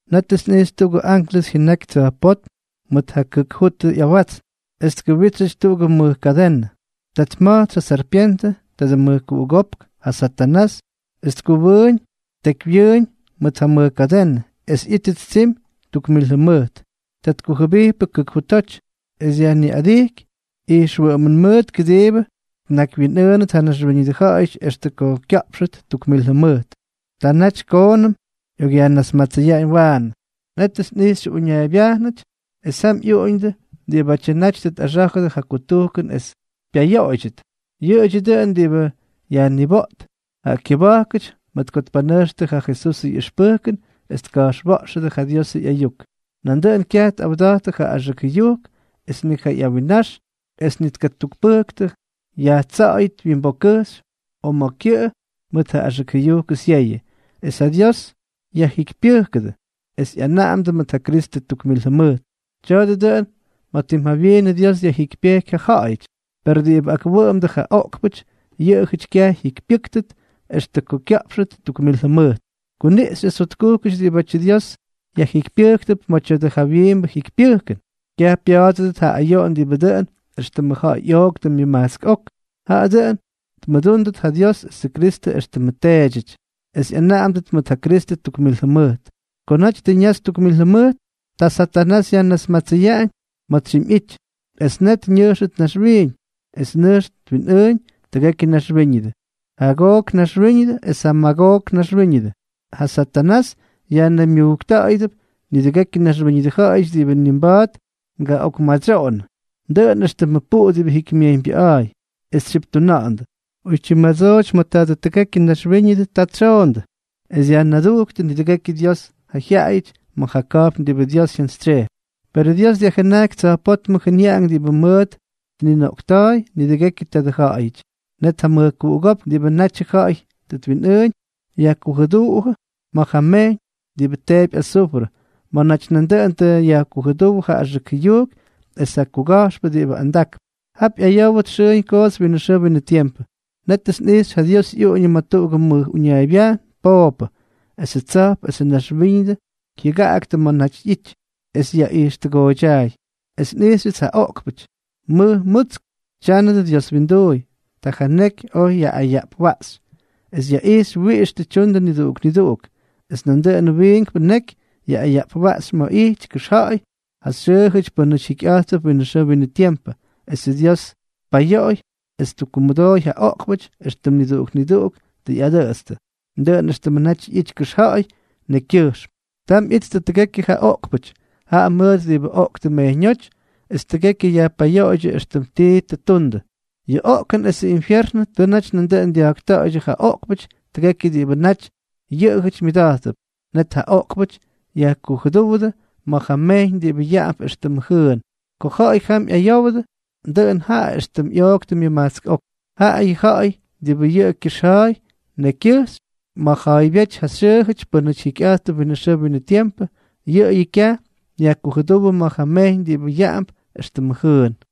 Nétʉts nꞌijxy tuꞌugʉ anklʉs jyʉnaky tsa̱jpótm mʉt ja kʉk jutʉ ꞌyawatsn, es tkʉwítsyʉty tuꞌugʉ mʉj kadenʉ. Ta tma̱jtsy ja sarpyentʉ, tadʉ mʉjkuꞌugópk, ja Satanás, es tkʉwʉꞌʉñ ttekywyʉꞌʉñ mʉt ja mʉj kadenʉ, es ꞌyítʉt tsimy tuk mil jʉmʉjt. Ta tkujʉbijpʉ kʉk jutoty, es dyajniꞌadijky ijxwʉꞌʉmʉn mʉʉt kʉdiibʉ tnakywyinꞌʉʉnʉt ja naxwíñʉdʉ ja̱ꞌa̱yʉty extʉ ko kya̱ꞌpxʉt tuk mil jʉmʉjt. Ta naty koonʉm ꞌyokꞌyajnasmatsʉyaꞌañ waanʉ. Nétʉts nꞌijxy uñaaybyajnʉty, es jam ꞌyuꞌuñʉdʉ diꞌibátyʉ naty tʉ tꞌaxá̱jʉdʉ ja kutujkʉn es pyayoꞌoydyʉt. Yʉꞌʉdyʉ dʉꞌʉn diꞌibʉ yajniboꞌt ja kyʉba̱jkʉty mʉt ko tpanʉjxtʉ ja Jesusʉ ꞌyʉxpʉjkʉn es tka̱jxwa̱ꞌxʉdʉ ja Diosʉ ꞌyayuk. Nandʉꞌʉn kyaj tꞌawda̱jttʉ ja axʉk jʉyujk es ni ja ꞌyawinnax, es ni tkakupʉjktʉ yajtsa̱ꞌa̱yʉt wyimbokkʉjxy o ma̱ kyʉꞌʉ mʉt ja axʉk jʉyujkʉ syeyʉ. Es ja Dios yajjikypyʉjkʉdʉ, es ꞌyanaꞌamdʉ mʉt ja Kristʉ tuk mil jʉmʉjt. Tya̱a̱dʉ dʉꞌʉn ma̱ tim jawyiinʉ Dios dyajjikypyejky ja ja̱ꞌa̱yʉty. Per diꞌibʉ akwʉꞌʉmdʉ ja oꞌkpʉty, yʉꞌʉjʉty kyaj jyikypyʉ́ktʉt extʉ ko kya̱ꞌpxʉt tuk mil jʉmʉjt. Kuniꞌxy es jotkujkʉty diꞌibátyʉ Dios yajjikypyʉ́kʉdʉp ma̱ tya̱dʉ jawyiimbʉ jikypyʉjkʉn. Kyaj pya̱a̱dʉdʉt ja ayoꞌon diꞌibʉ dʉꞌʉn éxtʉmʉ ja̱ꞌa̱y ꞌyooktʉ myʉmajtsk ok, jaꞌa dʉꞌʉn tmʉdúndʉt ja Dios esʉ Kristʉ éxtʉmʉ teedyʉty, es ꞌyanaꞌamdʉt mʉt ja Kristʉ tuk mil jʉmʉjt. Ko naty tʉ ñaxy tuk mil jʉmʉjt, ta Satanás yajnasmatsʉyaꞌañ ma̱ tsyimyꞌity. Es net ñʉjxʉt naxwiiñ, es nʉjx twinꞌʉʉñ tʉgekyʉ naxwíñʉdʉ, ja Gook naxwíñʉdʉ esʉ Magook naxwíñʉdʉ. Ja Satanás yajnaymyujkta̱ꞌa̱yʉdʉp nidʉgekyʉ naxwíñʉdʉ ja̱ꞌa̱yʉty diꞌibʉ ni mba̱a̱t ngaꞌokmadsyoꞌonʉ, dʉꞌʉn éxtʉmʉ puꞌu diꞌibʉ jikymyejyñbyʉꞌa̱a̱y, es tsyiptuna̱ꞌa̱ndʉ. Oytyim madsooty ma̱ tʉgekyʉ naxwíñʉdʉ ta tsyoꞌondʉ, es dyajnadujktʉ nidʉgekyʉ Dios ja jyaꞌayʉty ma̱ ja ka̱jpn diꞌibʉ Dios jyantsytsyejpy. Perʉ Dios dyajjʉnajky tsa̱jpótmʉ jʉnyaꞌank diꞌibʉ mʉʉt tninoꞌkta̱a̱y nidʉgekyʉ tadʉ ja̱ꞌa̱yʉty. Net ja mʉjkuꞌugópk diꞌibʉ natyʉ ja̱ꞌa̱y tʉ twinꞌʉʉñ, yajkujʉduꞌujʉ ma̱ ja mejyñ diꞌibʉ teepy azufrʉ, ma̱ naty nandʉꞌʉn tʉ yajkujʉdúwʉ ja axʉk jʉyujk es ja kuga̱jxpʉ diꞌibʉ andakp. Jap ꞌyayówʉt xʉʉñ koots winʉ xʉʉ winʉ tiempʉ. Nétʉts nꞌijxy ja Dios ꞌyuꞌuñʉ ma̱ tuꞌugʉ mʉj uñaaybyajn pooppʉ. Esʉ tsa̱jp esʉ naxwíñʉdʉ jyʉgaktʉ ma̱ naty ꞌyity, es yaꞌijxtʉgooydyaay. Es nꞌijxyʉts ja oꞌkpʉty, mʉj mutsk, tyánʉdʉ Dios winduuy. Ta ja neky oj yaꞌꞌayaꞌpwaꞌxy, es yaꞌixy wiꞌix tʉ tyundʉ niduꞌuk niduꞌuk. Es nandʉꞌʉn wiinkpʉ neky yaꞌꞌayaꞌpwaꞌxy ma̱ ꞌyity kʉxja̱ꞌa̱y ja xyʉʉjʉty pʉ́nʉty jikyꞌa̱jttʉp winʉ xʉʉ winʉ tiempʉ. Esʉ Dios tpayoꞌoy es ttukkumʉdooy ja oꞌkpʉty éxtʉm niduꞌuk niduꞌuk tʉ ꞌyadʉꞌʉtstʉ, dʉꞌʉn éxtʉmʉ naty ꞌyity kʉxja̱ꞌa̱y nekykyʉjxm. Tam ꞌyijttʉ tʉgekyʉ ja oꞌkpʉty, jaꞌa mʉʉt diꞌibʉ oꞌktʉ mejyñóty, es tʉgekyʉ yajpayoꞌoydyʉ éxtʉm tii tʉ ttundʉ. Yʉ oꞌkʉn esʉ infyernʉ tʉ naty nandʉꞌʉn dya̱jkta̱ꞌa̱ydyʉ ja oꞌkpʉty tʉgekyʉ diꞌibʉ naty yʉꞌʉjʉty myʉda̱jttʉp. Net ja oꞌkpʉty yajkujʉdúwʉdʉ ma̱ ja mejyñ diꞌibʉ yaꞌamp éxtʉmʉ jʉʉn. Ko ja̱ꞌa̱y jam ꞌyayowdʉ, dʉꞌʉn jaꞌa éxtʉm ꞌyooktʉ myʉmajtsk ok. Jaꞌayʉ ja̱ꞌa̱y diꞌibʉ xyʉʉ kʉxja̱ꞌa̱y nekykyʉjxy ma̱ yajja̱a̱ybyéty ja xyʉʉjʉty pʉ́nʉty jikyꞌa̱jttʉp winʉ xʉʉ winʉ tiempʉ, yʉꞌʉyʉ kyaj yajkujʉdúwʉdʉ ma̱ ja mejyñ diꞌibʉ yaꞌamp éxtʉmʉ jʉʉn.